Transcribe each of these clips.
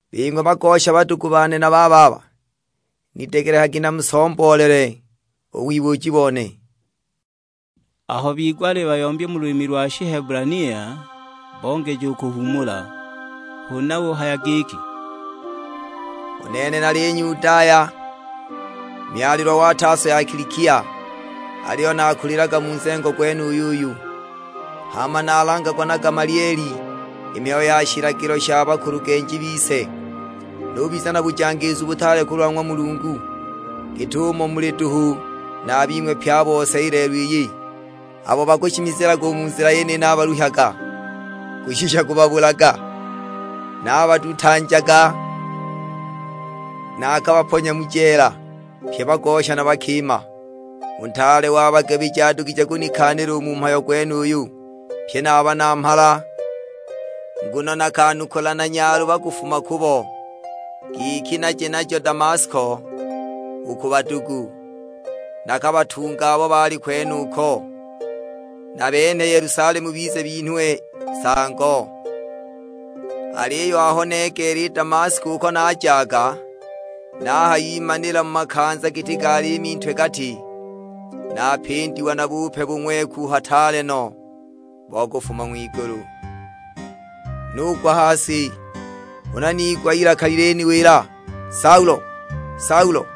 "Bing'we bagosha badugu bane na bababa, nidegelekagi namusomboolele u wibuuji bone." Aho bigwa alibayombya mu lulimi lo Shihebulania, bongeja u kuhuumula. Huna uhaya giki, "U nene nali Nyudaya, myalilwa wa Taso ya Kilikia. Aliyo naakulilaga mu nzengo gwenuyu uyu; hama naalangagwa na Gamalieli i mihayo ya shilagilo sha bakulugenji bise, nubiza na bujangiizu butaale kulwa ng'wa Mulungu, git'umo muli duhu na a bing'we pye a bose i lelo iyi. Abo bakushimizilaga u mu Nzila yeniyi naabaluhyaga kushisha kubabulaga; naabadutanjaga, naakabaponya mu jeela, pye bagosha na bakima. U ntaale wa bagabiji adugije kunikaanila u mu mhayo gwenuyu, pyi na a banamhala. Nguno nakanukula na nyaluba kufuma kubo, giki naje najo Damasko u ku badugu, nakabatunge abo baali kwenuko, nabenhe Yelusalemu bize binhwe nsango. "Aliyo aho negeela i Damasko uko najaga, nahayimanila mu makanza giti ga liimi ntwe-gati, napindiwa na bupe bung'weku hataale no, bo kufuma ng'wigulu. Nugwa ha si; huna niigwa ilaka liliniwila, 'Saulo, Saulo,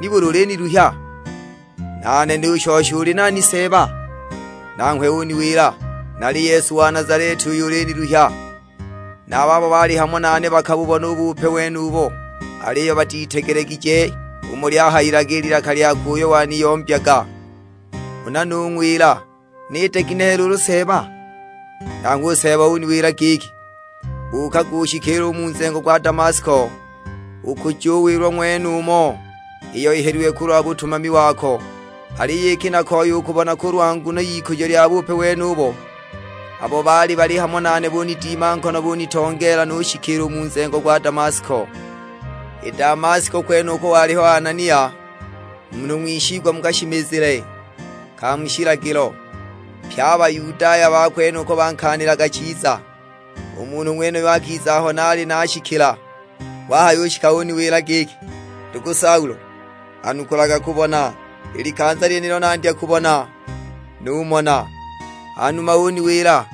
nibuli uliniluhya?' Nane nushosha, 'Uli nani Seeba?' Nanghwe uniwila, 'Nali Yesu wa Nazaleti uyo uliniluhya!' Na a babo baali hamo nane bakabubona u bupe wenubo, aliyo batitegelegije umo lyahayilaga i lilaka lyakwe uyo waniyombyaga. Huna nung'wila, 'Niite ginehe luulu Seeba?' Nanghwe u Seeba uniwila giki, 'Buukaga ushikiile u mu nzengo gwa Damasko, ukujuwilwa ng'wenumo iyo ihelilwe kulwa butumami wako.' Aliyo iki nakoya u kubona kulwa nguno y'ikujo lya bupe wenubo, abo baali hamo nane bunidima nkono bunitongeela nushikiila u mu nzengo gwa Damasko. "I Damasko kwenuko waliho Anania, munhu ng'wishigwa mu kashimizile ka mu shilagilo, pye a Bayudaya ba kwenuko bankaanilaga chiza. U munhu ng'wenuyo akiza aho naali nashikila; wahayushika uniwila giki, 'Ndugu Saulo, anukulaga kubona!' I likanza lyenilo nandya kubona, numona. Hanuma uniwila,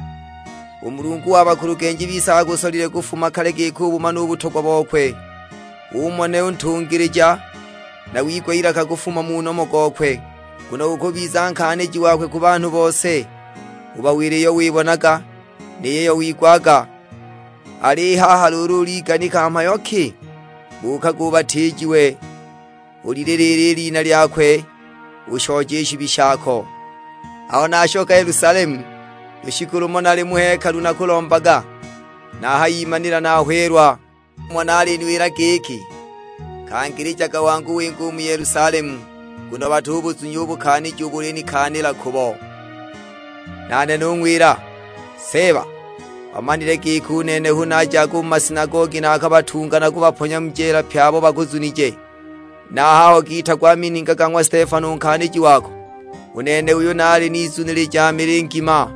'U Mulungu wa bakulugenji bise akusolile kufuma kale giki ubumane u butogwa bokwe, umone u Ntungilija, na wigwe ilaka kufuma mu nomo gokwe. Nguno ukubiza nkaaniji wakwe ku banhu bose, ubawile iyo wibonaga, ni yiyo wigwaga. Al'i haha luulu uliganika mhayo ki? Buukaga ubatiijiwe, ulililiile i lina lyakwe ushooje i shibi shako.' "Aho nashoka Yelusalemu, lushiku lumo naali mu hekalu nakulombaga, nahayimanila nahweelwa. Numona aliniwila giki, 'Kangilijaga wangu winge u mu Yelusalemu, nguno batubuzunya u bukaaniji ubo ulinikaanila kubo.' Nane nung'wila, 'Seeba, bamanile giki u nene hu najaga u mu masinagogi naakabatunga na kubaponya mu jeela pye abo bakuzunije. Na a haho giitagwa a mininga ga ng'wa Stefano u nkaaniji wako, u nene uyu naali nizunilija mili ngima,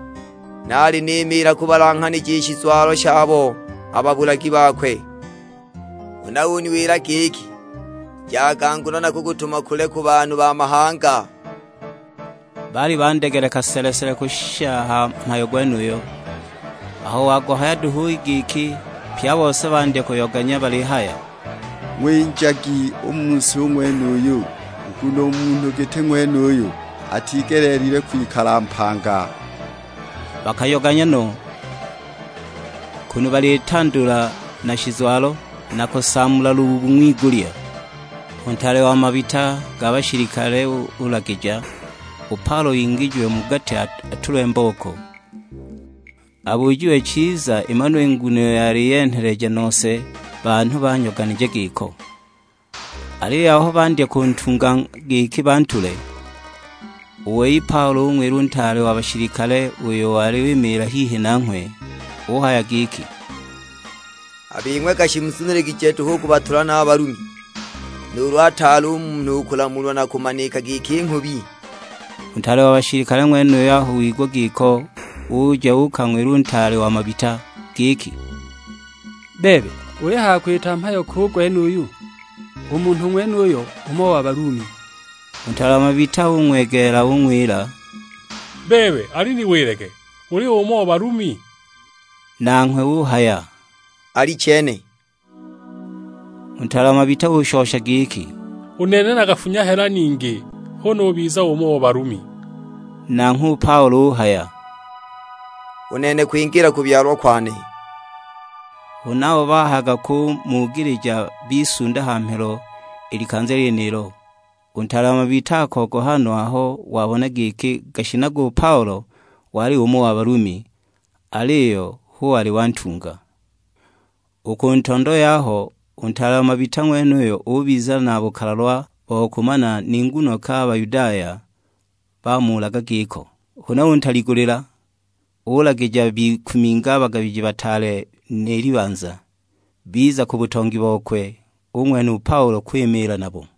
naali nimiila kubalanghanija i shizwalo shabo a babulagi bakwe!' Huna uniwila giki, 'Jaga, nguno nakukutuma kule ku banhu ba mahanga.' " Baali bandegeleka sele-sele kushisha ha mhayo gwenuyo; aho waguhaya duhu i giki, pye a bose bandya kuyoganya balihaya, "Ng'winjagi u mu si u ng'wenuyu, nguno u munhu giti ng'wenuyu atigeleelilwe kwikala mpanga!" Bakayoganya no, kunu balitandula na shizwalo, na kusaamula lubuubu ng'wigulya. U ntaale wa mabita ga bashilikale ulagija, u Paulo ingijiwe mu gati atulwe mbooko, abujiwe chiza imanwe i nguno iyo yali yenheleja nose banhu banyoganije giko. Aliyo aho bandya kuntunga giki bantule, u wei u Paulo ung'wila u ntaale wa bashilikale uyo wali wimiila hihi nanghwe; uhaya giki, "A bing'we gashi muzuniligije duhu u kubatula na a Balumi, nuulu ataali u munhu u kulamulwa na kumanika giki nghubi?" U ntaale wa bashilikale ng'wenuyo aho wigwa giko uja uukang'wila u ntaale wa mabita; giki, "Bebe ulihaya kwita mhayo ki u gwenuyu? U munhu ng'wenuyo umo wa Balumi!" U ntaale wa mabita ung'wegeela ung'wila, "Bebe aliniwilage, uli umo wa Balumi?" Nanghwe uhaya, "Alichene!" U ntaale wa mabita ushosha giki, "U nene nakafunya hela ningi hu nubiza umo wa Balumi!" Nanghwe u Paulo uhaya, "U nene kwingiila kubyalwa kwane!" Huna abo bahayaga kumugilija bisunda ha mhelo i likanza lyenilo; u ntaale wa mabita akogoha no aho wabona giki gashinaga u Paulo wali umo wa Balumi, aliyo hu wali wantunga! U ku ntondo yaho, u ntaale wa mabita ng'wenuyo ubiza na bukalalwa bo kumana ni nguno ki a Bayudaya bamuulaga giko; huna untaligulila, ulagija bikuminge a bagabiji bataale ni libanza. Biza ku butongi bokwe, ung'wenha u Paulo kwimiila nabo.